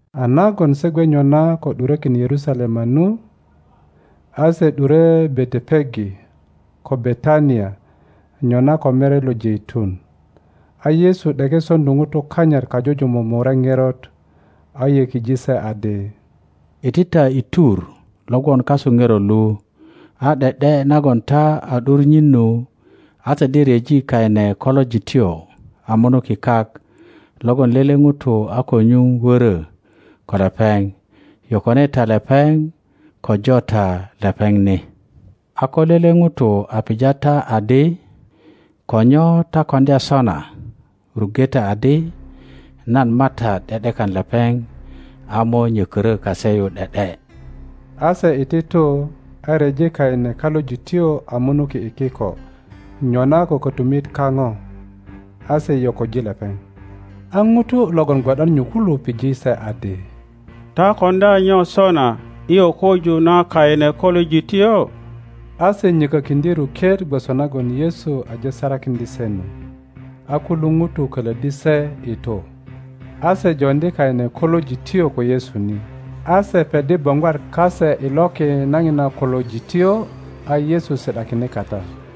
A nagon se gwe nyona ko ’durökin Yerusalema nu, a se ’dure Betepage ko Betania nyona ko Mere lo Jeitun, a Yesu ’deke soŋdu ŋutu kanyit kajujumuk murek ŋerot, a yökije se adi, Iti ta i tur lo gwon kasu ŋerot lu, a ’de ’de nagon ta a ’dur nyin nu, a ta de ryeji kaine kolojityo a munuki kak, logon lele ŋuto a ko nyuŋ woro ko lepeŋ; yokone ta lepeŋ ko jo ta lepeŋ ni. A ko lele ŋuto a pija ta adi, Ko nyo ta koŋdya sona? ruŋge ta adi, nan MATAT ’de ’dekan lepeŋ a mo nyökorö kase yu ’de ’de. A se iti tu, a ryeji kaine kolojityo a munuki i kiko nyona ko kotumit kaŋo. A se yoköji lepeŋ. a ŋutu logon gwo ’dan nyu kulu pije se adi, Ta koŋdya nyo sona i yokoju na kaine kolojityo? A se nyokokiŋdye ruket gwoso nagon Yesu aje sarakiŋdye se nu; a kulu ŋutu kolöddi se i tu. a se joŋdi kaine kolojityo ko Yesu ni, a se peddi boŋgwat kase i loki na ŋina kolojityo, a Yesu si ’dakine kata.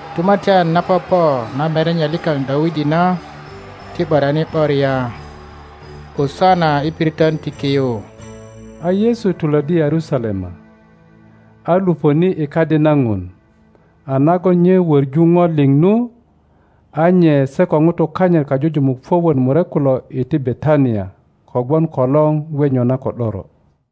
Tumatyan na popo na merenye likaŋ Dawidi na ti ’boriani ’boria! Osana i piriton ti ki yu! A Yesu tulöddi Yerusalema, a lupöni i Kadi na Ŋun; a nagon nye wöŋu ŋo liŋ nu, a nye se ko ŋutu kanyit kajujumuk puök wot murek kulo iti Betania kogwon kolor gwe nyona ko ’doro.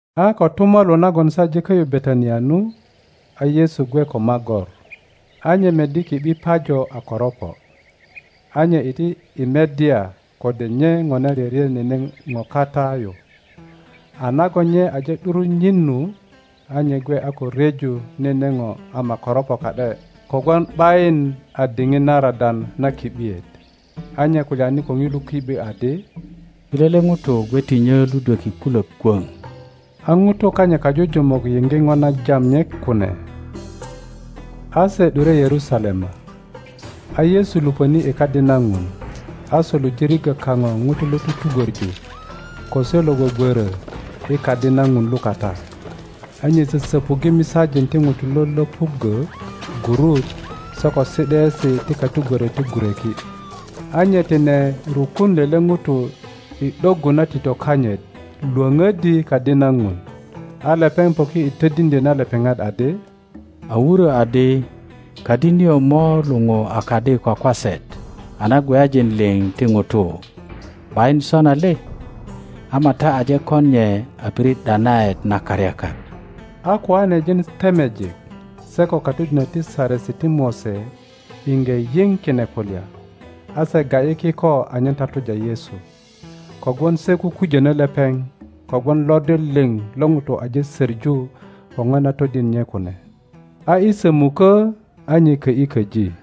A kotumalu nagon se aje kö ’yu Betania nu, a Yesu gwe ko magor, a nye meddi ki ’bi pajo a koropo, a nye iti i meddya kode nye ŋona ryöryö nene ŋo kata yu, a nagon nye aje ’dur nyin nu, a nye gwe a ko ryeju nene ŋo ama koropo ka ’de kogwon ’bayin a diŋit na radan na ki ’biet. A nye kulyani ko ŋilu ki ’bi adi, Ti lele ŋuto gwe ti nyö ludweki kulök kwöŋ. A ŋutu kanyit kajujumuk yiŋge ŋo na jam nye kune. A se ’dure Yerusalema, a Yesu lupöni i Kadi na Ŋun, a suluje riggö kaŋo ŋutu lo tutugwöŋu ko se lo gwögworö i Kadi na Ŋun lukata. A nye sösöpuŋge misajin ti ŋutu lo löpuggö gurut se ko si ’daesi ti katugwörök ti gureki; a nye tine rukun lele ŋuto i ’doggu na tito kanyit lwöŋöddi Kadi na Ŋun. A lepeŋ poki i todiŋdyo na lepeŋat adi, A wurö adi, Kadi nio mo luŋu a kadi kwakwaset a na gweyajin liŋ ti ŋutu. ’Bayin sona le? Ama ta aje kon nye a pirit ’danaet na karyakak. A koanejin temejik se ko katodinök ti Satesi ti Mose iŋge yiŋ kine kulya, a se ga ’yi kiko anyen tatuja Yesu; kogwon se kukujönö lepeŋ, kogwon lodir liŋ lo ŋutu aje söŋu ko ŋo na todin nye kune. A i sömukö a nye kö ’yi köji.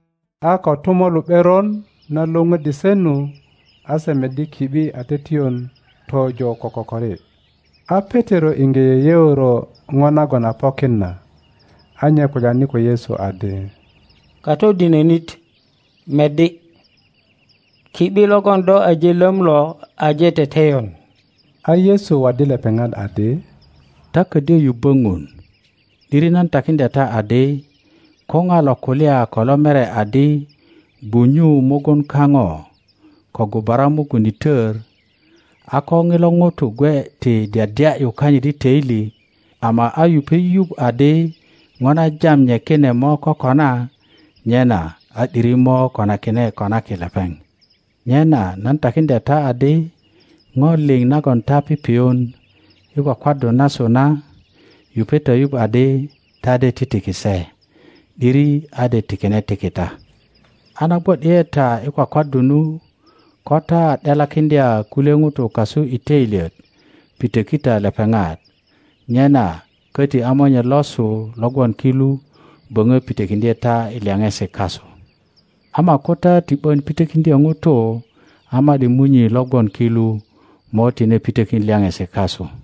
A kotumalu ’beron na lwöŋöddi se nu, a se meddi ki ’bi a teteyon tojo ko kokori. a Petero iŋge yeyeoro ŋo nagon a pokin na, a nye kulyani ko Yesu adi, Katodinönit, meddi! Ki ’bi logon do aje löm lo aje teteyon. a Yesu waddi lepeŋat adi, Ta ködyö yubbö Ŋun. Kor 13.2’Diri nan takiŋdya ta adi, Ko ŋa lo kulya ko lo mere adi, Gwunyu mugun kaŋo ko gubara mugun i tör, a ko ŋilo ŋuto gwe ti dyadya ’yu kanyit i töili, ama a yupe yuŋ adi ŋo na jam nye kine mo kokona, nyena a ’diri mo konakine konaki lepeŋ. Nyena nan takiŋdya ta adi, Ŋo liŋ nagon ta pipiyun i kwakwaddu nasu na, yupe ta yuŋ adi ta de titiki se, ’diri a de tikine tiki ta. A na gwo ’di ’e ta i kwakwaddu nu, ko ta a ’delakiŋdya kulye ŋutu kasu i toilyet, pitöki ta lepeŋat; nyena köti a Monye losu lo gwon ki lu böŋö pitökiŋdye ta i lyaŋesi kasu. [ Ama ko ta ti ’bön pitokiŋdyö ŋutu, a ma ’di Munyi lo gwon ki lu mo tine pitökin lyaŋesi kasu.]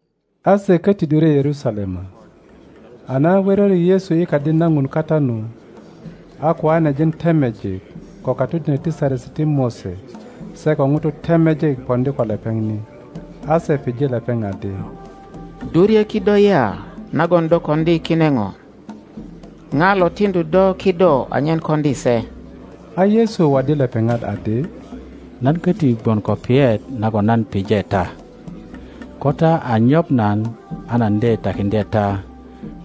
A se koti ’dure Yerusalema. A na wöröri Yesu i Kadi na Ŋun kata nu, a koanejin temejik ko katodinök ti Saresi ti Mose se ko ŋutu temejik poŋdi ko lepeŋ ni, a se pije lepeŋ adi, Do ryö kido ya nagon do koŋdi kine ŋo? Ŋa lo tiŋdu do kido anyen koŋdi se? A Yesu waddi lepeŋat adi, Nan köti gwon ko piyet nagon nan pije ta; ko ta a nyoŋ nan, a nan de takiŋdye ta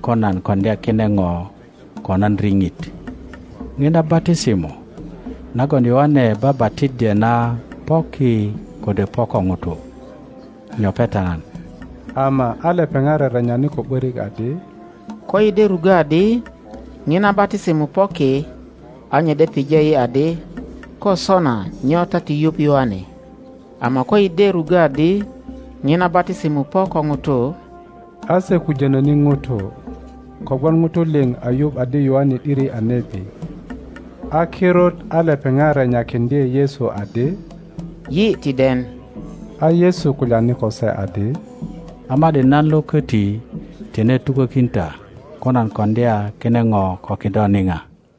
ko nan koŋdya kine ŋo ko nan riŋit. Ŋina batisimo nagon Yoane baba tiddye na po ki kode po ko ŋutu? Nyoŋe ta nan. Ama a lepeŋat rerenyani ko ’borik adi, Koyi de ruggö adi, Ŋina batisimo po ki, a nye de pije yi adi, Ko sona nyo ta ti yuŋ Yoane? Ama koyi de ruggo adi, Ŋina batisimo po ko ŋutu—a se kujono ni ŋutu, kogwon ŋutu liŋ a yuŋ adi Yoane ’diri a nebi. A kirut a lepeŋat renyakiŋdye Yesu adi, Yi ti den. A Yesu kulyani ko se adi, A ma ’di nan lo koti tine tukokin ta ko nan koŋdya kine ŋo ko kido niŋa.